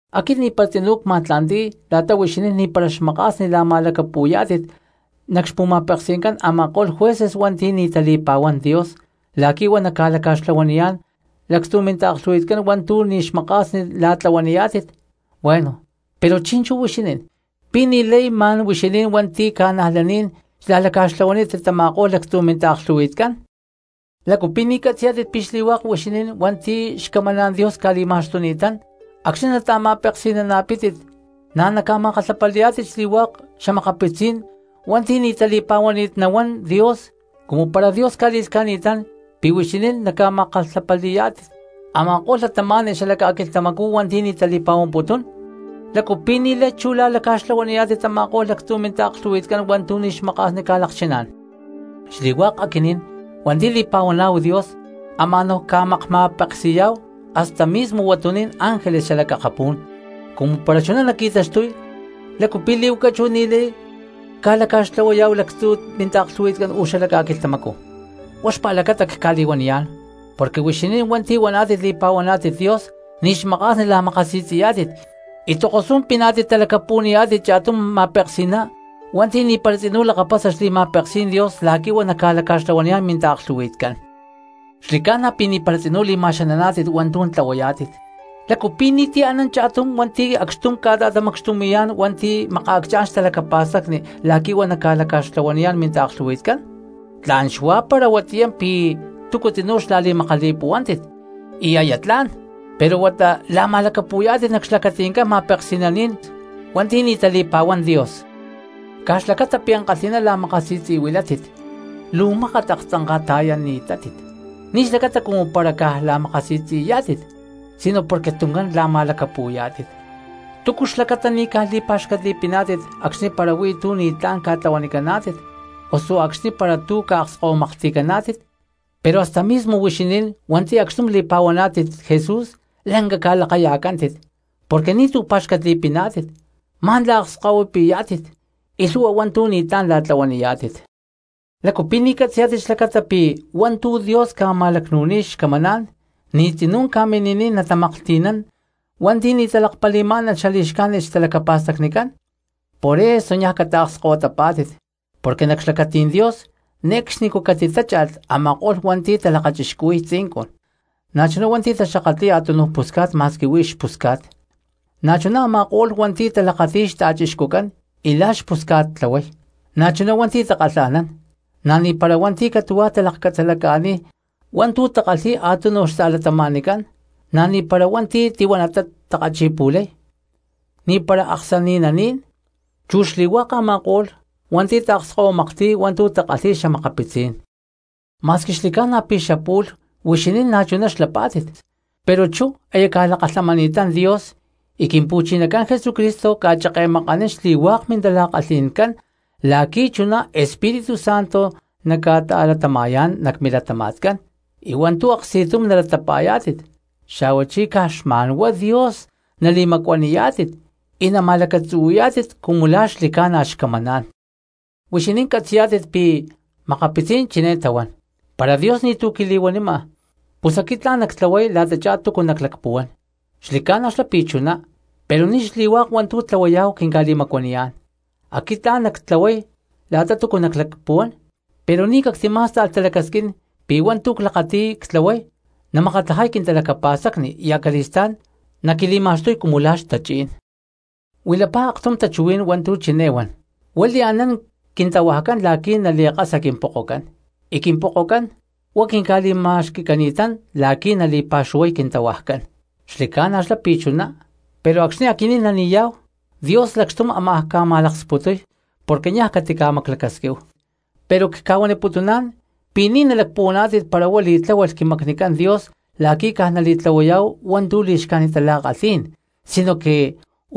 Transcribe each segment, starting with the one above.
Aquit ni̠para tzinú cma̠tla̠nti̠y la̠ta huixinín ni̠para xmaka̠sni la̠ma̠lacapu̠yá̠tit nac xpu̠ma̠peksi̠ncán a̠ma̠ko̠lh jueces hua̠nti̠ ni̠ tali̠pa̠huán Dios la̠qui̠ huá naca̠laca̠xtlahuaniyá̠n lactzu̠ mintaaklhu̠hui̠tcán hua̠ntu̠ ni̠ xmaka̠sni la̠tlahuaniyá̠tit. Bueno, pero chi̠nchú huixinín, ¿pi̠ ni̠lay ma̠n huixinín hua̠nti̠ ca̠najlaní̠n xla̠laca̠xtlahuanítit tama̠ko̠lh lactzu̠ mintaaklhu̠hui̠tcán? ¿Lácu pi̠ ni̠ catzi̠yá̠tit pi̠ xli̠hua̠k huixinín hua̠nti̠ xcamaná̠n Dios tali̠taxtuni̠tátit, acxní nata̠ma̠peksi̠nana̠pítit na̠ naca̠ma̠kalhapali̠yá̠tit xli̠hua̠k xa̠makapitzí̠n cristianos hua̠nti̠ ni̠ tali̠pa̠huani̠t nahuán Dios? Cumu para Dios ca̠li̠lhca̠ni̠tán pi̠ huixinín naca̠makma̠kalhapali̠yá̠tit a̠ma̠ko̠lh cristianos xala ca̠quilhtamacú hua̠nti̠ ni̠ tali̠pa̠huamputún, ¿lácu pi̠ ni̠lay chú la̠laca̠xtlahuaniyá̠tit tama̠ko̠lh lactzu̠ mintaaklhu̠hui̠tcán hua̠ntu̠ ni̠ xmaka̠sni ca̠lakchiná̠n? Xli̠hua̠k aquinín hua̠nti̠ li̠pa̠huaná̠hu Dios ama̠ná̠hu ca̠makma̠peksi̠yá̠hu hasta mismo huatuní̠n ángeles xalac akapú̠n. Cumu para chuná naqui̠taxtuy, ¿lácu pi̠ li̠huaca chú ni̠lay ca̠laca̠xtlahuayá̠hu lactzu̠ mintaaklhu̠hui̠tcán uú xala ca̠quilhtamacú? Huá xpa̠lacata cca̠li̠huaniyá̠n porque huixinín hua̠nti̠ huaná̠tit li̠pa̠huaná̠tit Dios ni̠ xmaka̠sni la̠makasi̠tzi̠yá̠tit y tokosú̠n piná̠tit talacapu̠niyá̠tit cha̠tum ma̠peksi̠ná hua̠nti̠ ni̠para tzinú lakapasa xli̠ma̠peksí̠n Dios la̠qui̠ huá naca̠laca̠xtlahuaniyá̠n minta̠klhu̠hui̠tcán. Xli̠ca̠na pi̠ ni̠para tzinú li̠ma̠xananá̠tit hua̠ntu̠ tlahuayá̠tit, ¿lácu pi̠ ni̠tu̠ anán cha̠tum hua̠nti̠ acxtum ca̠ta̠tamacxtumi̠yá̠n hua̠nti̠ makaacchá̠n xtalacapa̠stacni la̠qui̠ huá naca̠laca̠xtlahuaniyá̠n minta̠klhu̠hui̠tcán? Tla̠n xuá para huatiyá pi̠ túcu tzinú xla̠li̠makali̠puhuántit y aya tla̠n, pero huata la̠ma̠lacapu̠yá̠tit nac xlacati̠ncán ma̠peksi̠naní̠n hua̠nti̠ ni̠ tali̠pa̠huán Dios. Caj xlacata pi̠ ankalhi̠ná la̠makasi̠tzi̠huilátit luu mákat aktzanka̠ta̠yani̠tátit, ni̠ xlacata cumu para caj la̠makasi̠tzi̠yá̠tit sino porque tuncán la̠ma̠lacapu̠yá̠tit. ¿Túcu xlacata ni̠ caj li̠pa̠xcatli̠piná̠tit acxni̠ para tú ni̠tlá̠n ca̠tlahuanicaná̠tit osu acxni̠ para tú ca̠akskahuimaklhti̠caná̠tit? Pero hasta mismo huixinín hua̠nti̠ acxtum li̠pa̠huaná̠tit Jesús lanca ca̠lakaya̠cántit porque ni̠tu̠ pa̠xcatli̠piná̠tit, ma̠n la̠akskahuipi̠yá̠tit y lhu̠hua hua̠ntu̠ ni̠tlá̠n la̠tlahuaniyá̠tit. ¿Lácu pi̠ ni̠ catzi̠yá̠tit xlacata pi̠ hua̠ntu̠ Dios ca̠ma̠lacnu̠niy xcamaná̠n ni̠ tzinú ca̠mini̠niy natamaklhti̠nán hua̠nti̠ ni̠ talakpali̠má̠nalh xali̠xcájnit xtalacapa̠stacnicán? Por eso niaj cataakskahuitapá̠tit porque nac xlacatí̠n Dios ne̠cxnicú catitácha̠lh a̠ma̠ko̠lh hua̠nti̠ talakachixcuhui̠y tzincun, na̠chuná hua̠nti̠ taxakatli̠y a̠túnuj pusca̠t ma̠squi huí xpusca̠t, na̠chuná a̠ma̠ko̠lh hua̠nti̠ talakati̠y xta̠chixcucán y la̠ xpusca̠t tlahuay, na̠chuná hua̠nti̠ takalha̠nán, na̠ ni̠para hua̠nti̠ catu̠huá talakcatzalaca̠niy hua̠ntu̠ takalhi̠y a̠túnuj cristianos, na̠ ni̠para hua̠nti̠ tihuanatá takachi̠pu̠lay, ni̠para aksani̠naní̠n, chu xli̠hua̠k a̠ma̠ko̠lh hua̠nti̠ taakskahuimaklhti̠y hua̠ntu̠ takalhi̠y xa̠makapitzí̠n cristianos. Ma̠squi xli̠ca̠na pi̠ xapu̠lh huixinín na̠chuná xlapá̠tit, pero chú aya ca̠lakalhamani̠tán Dios y Quimpu̠chinacán Jesucristo ca̠cheke̠makanín xli̠hua̠k mintala̠kalhi̠ncán la̠qui̠ chuná Espíritu Santo naca̠ta̠latama̠yá̠n nac milatama̠tcán y hua̠ntu̠ aksti̠tum nalatapa̠yá̠tit, xa̠huachí caj xma̠nhuá Dios nali̠macuaniyá̠tit y nama̠lacatzuhui̠yá̠tit cumu la̠ xli̠ca̠na xcamaná̠n. Huixinín catzi̠yá̠tit pi̠ makapitzí̠n chiné tahuán: “Para Dios ni̠tu̠ quili̠huanima, pus aquit tla̠n nactlahuay la̠tachá túcu naclacpuhuán.” Xli̠ca̠na xlá pi̠ chuná, pero ni̠ xli̠hua̠k hua̠ntu̠ tlahuayá̠hu quinca̠li̠macuaniyá̠n. Aquit tla̠n nactlahuay la̠ta túcu naclacpuhuán pero ni̠ cactimá̠sta̠lh talacasquín pi̠ hua̠ntu̠ clakati̠y ctlahuay namakatlajay quintalacapa̠stacni y acali̠stá̠n naquili̠ma̠xtuy cumu la̠ xtachí̠n. Huilapá aktum tachuhuí̠n hua̠ntu̠ chiné huan: “Huá li̠anán quintahuajcán la̠qui̠ nali̠kasa quimpokocán, y quimpokocán huá quinca̠li̠ma̠xqui̠cani̠tán la̠qui̠ nali̠pa̠xuhuay quintahuajcán.” Xli̠ca̠na xlá pi̠ chuná, pero acxni̠ aquinín nani̠yá̠hu Dios lacxtum ámaj ca̠ma̠laksputuy porque niaj catica̠maclacasquíhu. Pero cca̠huaniputuná̠n pi̠ ni̠ nalacpuhuaná̠tit para huá li̠tláhualh quimacnicán Dios la̠qui̠ caj nali̠tlahuayá̠hu hua̠ntu̠ li̠xcájnit tala̠kalhí̠n sinoque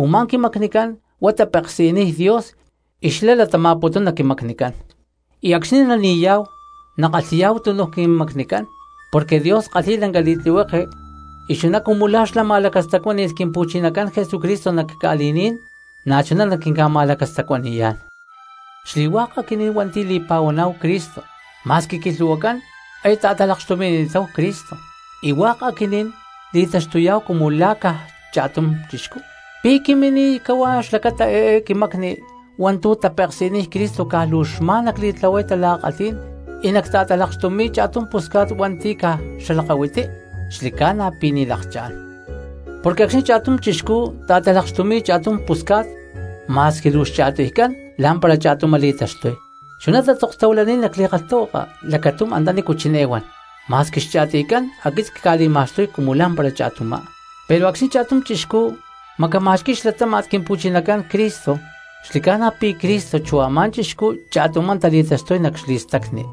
u̠má quimacnicán huá tapeksi̠niy Dios y xlá latama̠putún nac quimacnicán. Y acxni̠ nani̠yá̠hu nakalhi̠yá̠hu túnuj quimacnicán porque Dios kalhi̠y lanca li̠tlihueke y chuná cumu la̠ xlá ma̠lacastacuáni̠lh Quimpu̠chinacán Jesucristo nac ca̠li̠ní̠n na̠chuná naquinca̠ma̠lacastacuani̠yá̠n. Xli̠hua̠k aquinín hua̠nti̠ li̠pa̠huaná̠hu Cristo ma̠squi quilhu̠huacán aya ta̠talakxtumi̠ni̠táhu Cristo y hua̠k aquinín li̠taxtuyá̠hu cumu la̠ caj cha̠tum cristiano. ¿Pi̠ quimini̠niy cahuá xlacata eé quimacni hua̠ntu̠ tapeksi̠niy Cristo caj luu xma̠n nacli̠tlahuay tala̠kalhí̠n y nacta̠talakxtumi̠y cha̠tum pusca̠t hua̠nti̠ caj xalakahuiti? ¡Xli̠ca̠na pi̠ ni̠ lakchá̠n! Porque acxni̠ cha̠tum chixcú ta̠talakxtumi̠y cha̠tum pusca̠t ma̠squi luu xcha̠tiycán lá̠mpara cha̠tumá tali̠taxtuy. Chuná tatzokni̠t nac li̠kalhtahuaka lacatum antanícu chiné huan: “Ma̠squi xcha̠tiycán, aquit cca̠li̠ma̠xtuy cumu lá̠mpara cha̠tumá.” Pero acxni̠ cha̠tum cristiano macama̠xqui̠y xlatáma̠t Quimpu̠chinacán Cristo, xli̠ca̠na pi̠ Cristo chú a̠má cristiano cha̠tumá tali̠taxtuy nac xli̠stacni.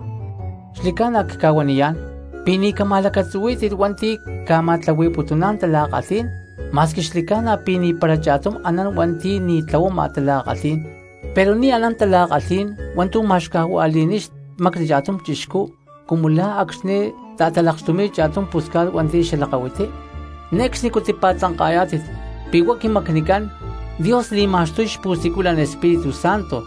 Xli̠ca̠na cca̠huaniyá̠n pi̠ ni̠ cama̠lacatzuhuí̠tit hua̠nti̠ ca̠ma̠tlahui̠putuná̠n tala̠kalhí̠n, ma̠squi xli̠ca̠na pi̠ ni̠para cha̠tum anán hua̠nti̠ ni̠ tlahuama tala̠kalhí̠n pero ni̠ anán tala̠kalhí̠n hua̠ntu̠ ma̠xcajua̠li̠niy xmacni cha̠tum chixcú cumu lá acxni̠ ta̠talakxtumi̠y cha̠tum pusca̠t hua̠nti̠ xalakahuití. Ne̠cxnicú tipa̠tzanka̠yá̠tit pi̠ huá quimacnicán Dios li̠ma̠xtuy xpu̠siculan Espíritu Santo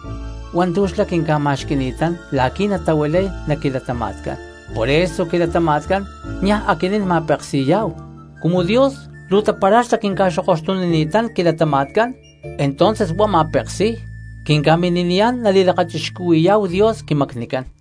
hua̠ntu̠ xlá quinca̠ma̠xqui̠ni̠tán la̠qui̠ natahuilay nac quilatama̠tcán, por eso quilatama̠tcán niaj aquinín ma̠peksi̠yá̠hu. Cumu Dios luu tapara̠xlá quinca̠xokoxtunini̠tán quilatama̠tcán, entonces huá ma̠peksi̠y, quinca̠mini̠niyá̠n nali̠lakachixcuhui̠yá̠hu Dios quimacnicán.